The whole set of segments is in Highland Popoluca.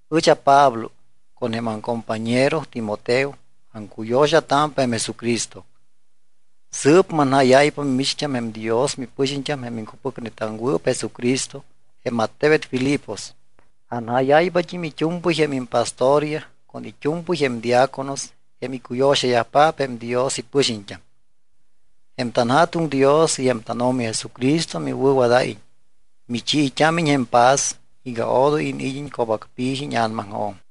Ɨch aPablo con jém aŋcompañero Timoteo aŋcuyo̱xatámpa jém Jesucristo. Sɨɨp manjáyáypa mimicht́am jém Dios mipɨxiñt́am jém iŋcupɨcnetaŋwɨɨp Jesucristo jém attebet Filipos. Anjáyáypat́im it́u̱mpɨy jém impastoryaj con it́u̱mpɨy jém diáconos jém icuyo̱xayajpaap jém Dios ipɨxiñt́am. Jém tanJa̱tuŋ Dios y jém tánO̱mi Jesucristo miwɨ̱wadáyiñ, michiit́ámiñ jém paz iga odoy iniid́iñ co̱bacpi̱ji íña̱namaŋjo̱m.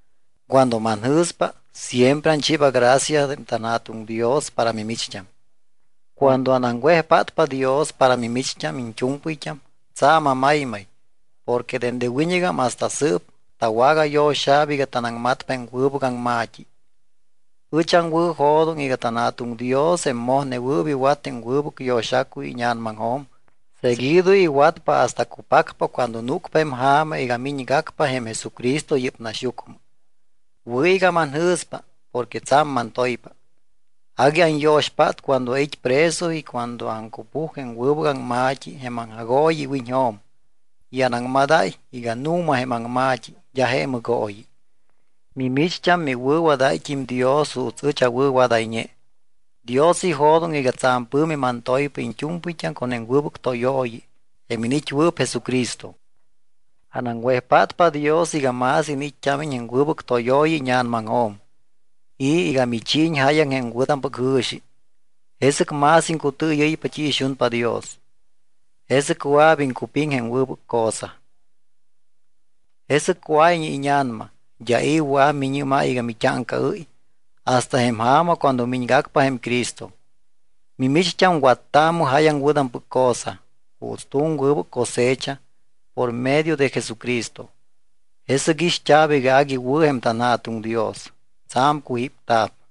Cuando manjɨ̱spa, siempre anchiiba gracia jém tanJa̱tuŋ Dios para mimicht́am. Cuando anaŋwejpátpa Dios para mimicht́am iñt́u̱mpɨyt́am, tsa̱m amaymay porque dende wiñɨgam hasta sɨɨp, tawagayo̱xa̱p iga tanaŋmatpa jém wɨbɨc aŋma̱t́i. Ɨch aŋwɨ̱jo̱doŋ iga tanJa̱tuŋ Dios jém mojnewɨɨp iwat jém wɨbɨc yo̱xacuy íña̱namaŋjo̱m, seguido iwatpa hasta cupacpa cuando núcpa jém ja̱ma iga miñgacpa jém Jesucristo yɨ́p naxyucmɨ. Wɨ̱ iga manjɨ̱spa porque tsa̱m mantoypa. Agui anyo̱xpát cuando ait́ preso y cuando aŋcupuj jém wɨbɨc aŋma̱t́i jém aŋjagooyi iwiñjo̱m y anaŋmadáy iga nu̱ma jém aŋma̱t́i d́a je mɨgooyi. Mimicht́am miwɨ̱wadáyt́im Dios juuts ɨch awɨ̱wadayñe. Dios ijo̱doŋ iga tsa̱m pɨ̱mi mantoypa iñt́u̱mpɨyt́am con jém wɨbɨc tóyooyi jém iniit́wɨɨp Jesucristo. Anaŋwejpátpa Dios iga más iniit́t́ámiñ jém wɨbɨc tóyooyi íña̱namaŋjo̱m y iga michiiñ jáyaŋ jém wɨ̱tampɨc jɨ̱xi. Jesɨc más iŋcutɨɨyɨ́ypa t́i ixunpa Dios. Jesɨc wɨa̱p iŋcupiŋ jém wɨbɨc cosa. Jesɨc cuáyñe íña̱nama, d́a i̱ wɨa̱p miñɨ́máy iga mit́áŋcaɨ́y hasta jém ja̱ma cuando miñgacpa jém Cristo. Mimicht́am wattaamɨ jáyaŋ wɨ̱tampɨc cosa juuts tu̱m wɨbɨc cosecha por medio de Jesucristo. Jesɨc ixt́a̱p iga agui wɨ̱ jém tanJa̱tuŋ Dios, tsa̱m cujípta̱p.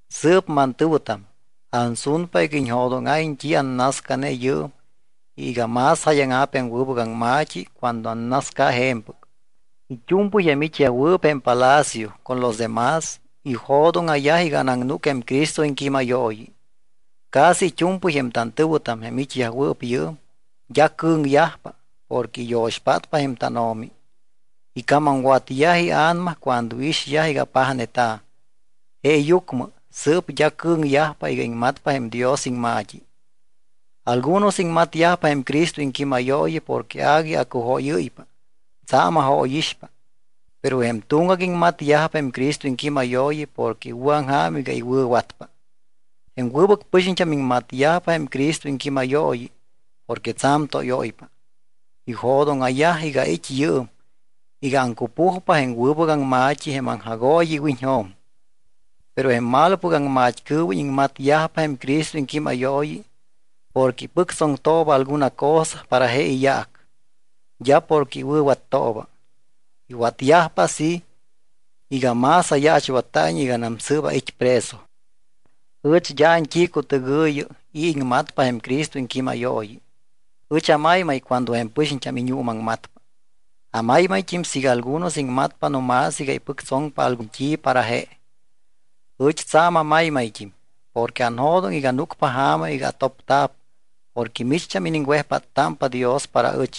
Sɨɨp mantɨ̱wɨtam, ansunpa iga iñjo̱dóŋa̱iñ t́i annascane yɨɨm y iga más jáyaŋa̱p jém wɨbɨc aŋma̱t́i cuando annasca je̱mpɨc. It́u̱mpɨy jém it́yajwɨɨp jém palacio, con los de más, ijo̱dóŋa̱yaj iga anaŋnúc jém Cristo iŋquímayooyi. Casi it́u̱mpɨy jém tantɨ̱wɨtam, jém it́yajwɨɨp yɨɨm, d́a cɨ̱ŋyajpa porque iyo̱xpátpa jém tánO̱mi. Icamamwatyaj ia̱nama cuando iixyaj iga apajneta̱. Jeeyucmɨ sɨɨp d́a cɨ̱ŋyajpa iga iŋmatpa jém Dios iŋma̱t́i. Algunos iŋmatyajpa jém Cristo iŋquímayooyi porque agui acujóyɨ́ypa, tsa̱m ajóyixpa. Pero jém tuŋgac iŋmatyajpa jém Cristo iŋquímayooyi porque iwɨ̱aŋja̱m iga iwɨ̱watpa. Jém wɨbɨc pɨxiñt́am iŋmatyajpa jém Cristo iŋquímayooyi porque tsa̱m tóyóypa. Ijo̱dóŋa̱yaj iga ait́ yɨɨm iga aŋcupujpa jém wɨbɨc aŋma̱t́i jém aŋjagooyi iwiñjo̱m. Pero jém malopɨc aŋmat́cɨɨwiñ iŋmatyajpa jém Cristo iŋquímayooyi porque ipɨctsoŋtooba alguna cosa para je iyaac, d́a porque iwɨ̱wattooba. Iwatyajpa así iga más ayaachwatta̱iñ iganam sɨɨp ait́ preso. Ɨch d́a ant́icutɨgɨ̱yi i̱ iŋmatpa jém Cristo iŋquímayooyi. Ɨch amaymay cuando jém pɨxiñt́am iñuumaŋmatpa. Amaymayt́im siiga algunos iŋmatpa no más iga ipɨctsoŋpa algun t́i para je. Ɨch tsa̱m amaymayt́im porque anjo̱doŋ iga núcpa ja̱ma iga atopta̱p porque micht́am iniŋwejpáttámpa Dios para ɨch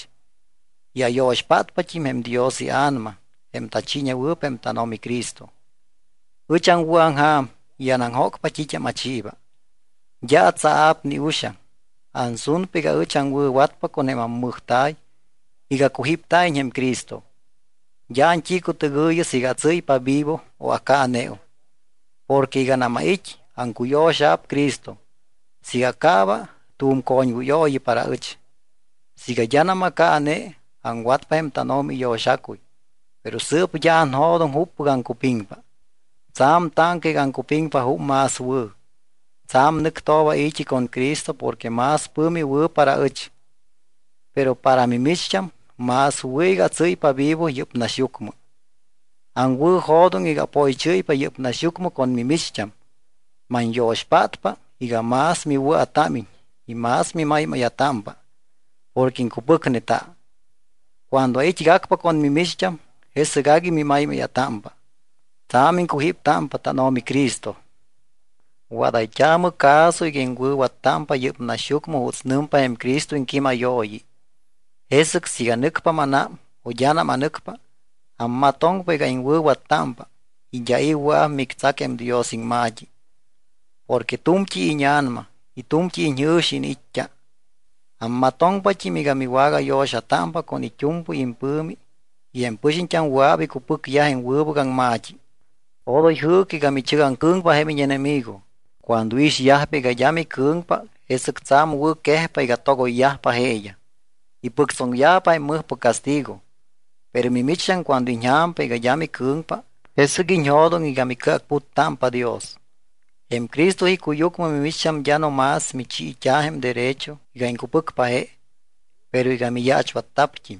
y ayo̱xpátpat́im jém Dios iA̱nama jém tachiiñewɨɨp jém tánO̱mi Cristo. Ɨch aŋwɨ̱aŋja̱m y anaŋjócpa t́it́am achiiba. D́a atsaa̱p ni uxaŋ. Ansunpa iga ɨch aŋwɨ̱watpa con ammɨjta̱y iga cujípta̱iñ jém Cristo. D́a ant́icutɨgɨ̱yi siiga atsɨ́ypa vivo o acaaneum. Porque iganam ait́, aŋcuyo̱xa̱p Cristo. Siiga acaaba, tu̱m coñwɨyooyi para ɨch. Siiga d́anam acaane, aŋwatpa jém tánO̱mi iyo̱xacuy, pero sɨɨp d́a anjo̱doŋ juppɨc aŋcupiŋpa. Tsa̱m táŋca iga aŋcupiŋpa jup más wɨ̱. Tsa̱m nɨctooba ai̱t́i con Cristo porque más pɨ̱mi wɨ̱ para ɨch. Pero para mimicht́am más wɨ̱ iga atsɨ́ypa vivo yɨ́p naxyucmɨ. Aŋwɨ̱jo̱doŋ iga apoychɨ́ypa yɨ́p naxyucmɨ con mimicht́am. Manyo̱xpátpa iga más miwɨa̱támiñ y más mimaymáya̱támpa porque iŋcupɨcneta. Cuando ait́gacpa con mimicht́am, jesɨc agui mimaymáya̱támpa, tsa̱m iŋcujíptámpa tánO̱mi Cristo. Wadayt́aamɨ caso iga iŋwɨ̱wattámpa yɨ́p naxyucmɨ juuts nɨmpa jém Cristo iŋquímayooyi. Jesɨc siiga nɨcpa mánám o d́anam anɨcpa, ammatoŋpa iga iŋwɨ̱wattámpa y d́a i̱ wɨa̱p mictsac jém Dios iŋma̱t́i porque tu̱mt́i íña̱nama y tu̱mt́i iñjɨ̱xi iniit́t́a. Ammatoŋpat́im iga miwagayo̱xatámpa con it́u̱mpɨy impɨ̱mi iga jém pɨxiñt́am wɨa̱p icupɨcyaj jém wɨbɨc aŋma̱t́i. Odoy jɨɨcɨ iga michɨgaŋcɨ̱ŋpa jém íñenemigo. Cuando iixyajpa iga d́a micɨ̱ŋpa, jesɨc tsa̱m wɨ̱quejpa iga togoyyajpa jeeyaj, ipɨctsoŋyajpa jém mɨjpɨc castigo. Pero mimicht́am cuando iñja̱mpa iga d́a micɨ̱ŋpa, jesɨc iñjo̱doŋ iga micɨacputtámpa Dios. Jém Cristo icuyucmɨ mimicht́am d́a no más michiit́a̱ jém derecho iga iŋcupɨcpa je, pero iga miyaachwatta̱pt́im.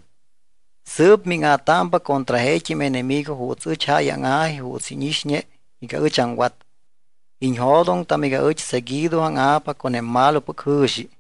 Sɨɨp míŋa̱támpa contra jeet́im enemigo juuts ɨch jáy áŋa̱ji juuts íñixñe iga ɨch aŋwat. Iñjo̱doŋtam iga ɨch seguido áŋa̱pa contra jém malopɨc jɨ̱xi.